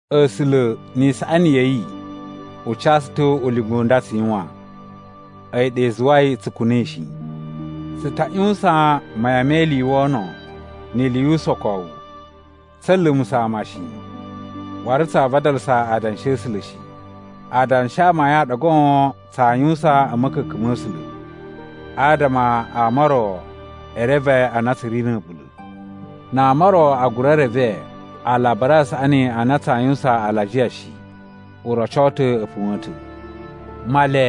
A̱sula̱, ni isaꞌani ya̱ yi, u ca tsu ta̱ ulinga u nda tsu yuwan. A̱yi ɗa i zuwai tsu kuna̱i shi. Tsu ta ꞌyuwusan mayan me ili i wono ni ili yu usokowu. Tsa̱a̱ lumusa̱ ama shi, waru tsaa vadalasa adanshi a̱ A̱sula̱ shi. Adanshi a amayun a ɗa goon tsaa yuwusan a̱ ma̱ka̱ka̱n ma̱ A̱sula̱, adama ama o ro e reve a na tsu ri na̱ a̱ɓula̱. Na ama o ro a gura reve Alabari a Saꞌani a na tsaa yuwusan alajiya shi, u roco ta̱ a̱ puwa̱a̱n ta̱. Male,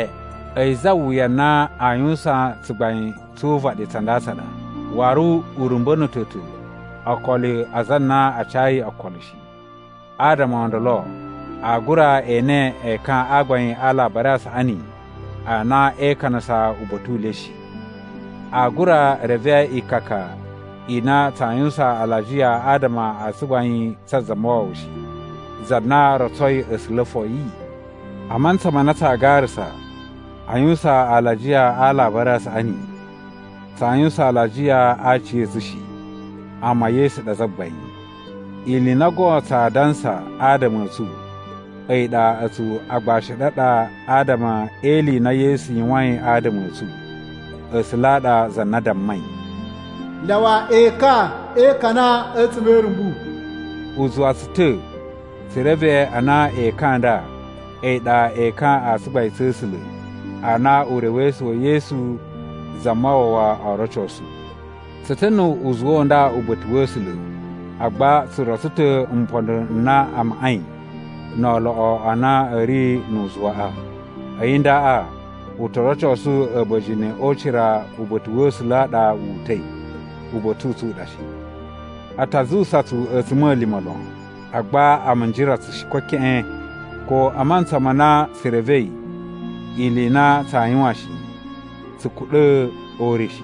a̱yi za wuya na a yuwusan tsugbain tsu uvaɗi tsa nda tsa ɗa. Waru u rumba̱na̱to ta̱ okolo a aza a na a cayi okolo shi, adama o ndolo aa gura ene ekan a gbain a Alabari a Saꞌani a na e ikanasa uba̱ta̱ u le shi. Aa gura reve ikaka i na tsaa yuwusan alajiya adama a tsugbain tsa Zamawawa shi, za na rotsoi A̱sula̱ foyi. A mantsa ma na tsaa garasa a yuwusan alajiya a Alabari a Saꞌani, tsaa yuwusan alajiya a aciya̱tsu shi, amma Yesu ɗa Zagbain. Ili i na goon tsaa dansa adama a̱ tsu, a̱yi ɗa a̱tsu agbashi a̱ ɗu a ɗa adama e ili i na Yesu yuwain adama a̱ tsu. A̱sula̱ a ɗa za na dammai, “Lyawa ekan e ikana a̱tsuma̱ e irumbu!” U zuwa tsu ta̱ tsu reve a na ekan a nda a̱yi ɗa ekan a tsugbain tsa̱ A̱sula̱ a na urewesu wa̱ Yesu Zamawawa oo rocosu. Tsu ta̱ nu uzuwa u nda uba̱ta̱ wa̱ A̱sula̱, agba tsu rotso ta̱ mpondo n na a maꞌai no oloꞌo a na a̱ ri nu uzuwaꞌa. A̱yi ndaꞌa u to rocosu a̱ba̱jini o ucira uba̱ta̱ wa̱ A̱sula̱ a ɗa wu uta̱i, uba̱ta̱ u tsu u ɗa shi. A ta zuwusa tsu a̱tsuma̱lima̱ lon, agba a minjira tsu shi ko keꞌen. Ko a mantsa ma na tsu revei ili i na tsaa yuwan shi, tsu kuɗa̱ o ure shi.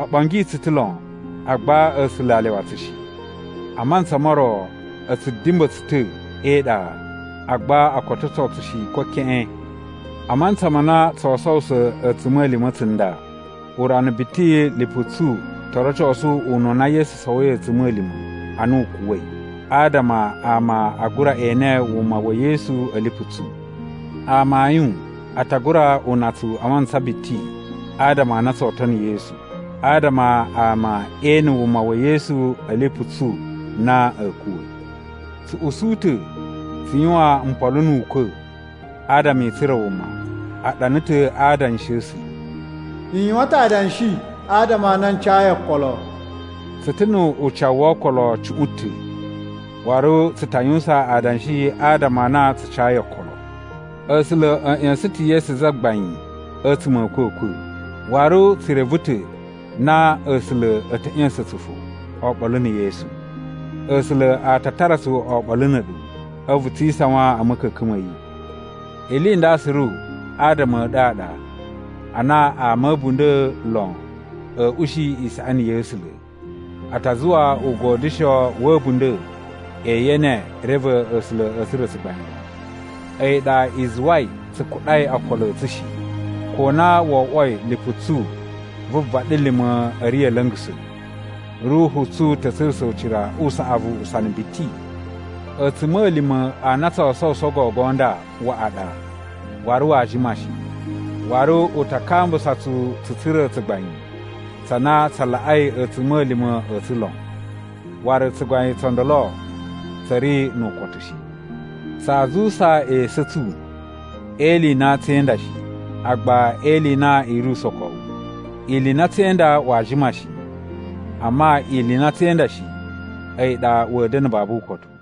O ɓongi tsu ta̱ lon, agba A̱sula̱ a lyawa tsu shi. A mantsa mo ro a̱ tsu dimba̱ tsu ta̱ e iɗa, agba o kototo tsu shi ko keꞌen. A mantsa ma na tsoo sowuso a̱tsuma̱lima̱ tsunda, urana biti lipu tsu to rocosu ununa Yesu sowoi a̱tsuma̱lima̱ ana u kuwa̱i, adama ama a gura ene wuma wa̱ Yesu a̱ lipu tsu. Amayun, a ta gura una tsu a mantsa biti adama a na tsoo tono Yesu, adama ama ee ene wuma wa̱ Yesu a̱ lipu tsu na a̱a̱ kuwa̱. Tsu usu ta̱ tsu yuwan mpolo nu ukwa̱, adama i tsura̱ wuma. A ɗana ta̱ a Adanshi a̱ A̱sula̱, “N yuwan ta̱ adanshi adama a na n cayi okolo.” Tsu ta̱ nu ucawu wo okolo cuꞌun ta̱, waru tsu ta yuwusan adanshi adama a na tsu cayi okolo. A̱sula̱ a̱ ꞌya̱sa̱n ta̱ Yesu Zagbain a̱tsuma̱ a̱ a̱kwa̱kwa̱, waru tsu reve ta̱ na A̱sula̱ a̱ ta̱ ꞌya̱sa̱n tsu fo oɓolo na̱ Yesu. A̱sula̱ a ta tara tsu oɓolo na̱ a̱ɗu, a̱vu tsi isawain a̱ ma̱ka̱ka̱n ma̱ yi. Ili i nda suru adama a̱ ɗu a ɗa, ana ama a̱ a̱bunda̱ lon a̱a̱ ushi isaꞌani ya̱ A̱sula̱, a ta zuwa ugodyusho wa̱ a̱bunda̱ e yene reve A̱sula̱ a̱ tsura̱ tsugbain lon. A̱yi ɗa i zuwai tsu kuɗai okolo a̱ tsu shi. Ko na wo oꞌwoi lipu tsu vu vaɗilima̱ ri a̱ la̱nga̱sa̱, ruhu tsu ta̱ tsurusa̱ ucira u saꞌavu usana biti. A̱tsuma̱lima̱ a na tsoo sowuso gogo nda waꞌa ɗa, waru waa jima shi. Waru u ta kambusa tsu tsu tsura̱ tsugbain tsa na tsa laꞌai a̱tsuma̱lima̱ a̱ tsu lon, waru tsugbain tso ndolo tsa̱ ri nu ukotu shi. Tsaa zuwusa esu a̱ tsu e ili i na tsee inda shi, agba e ili i na i ri usokowu. Ili i na tsee inda waa jima shi, amma ili i na tsee inda shi a̱yi ɗa wa̱a̱ da̱na̱ babu ukotu.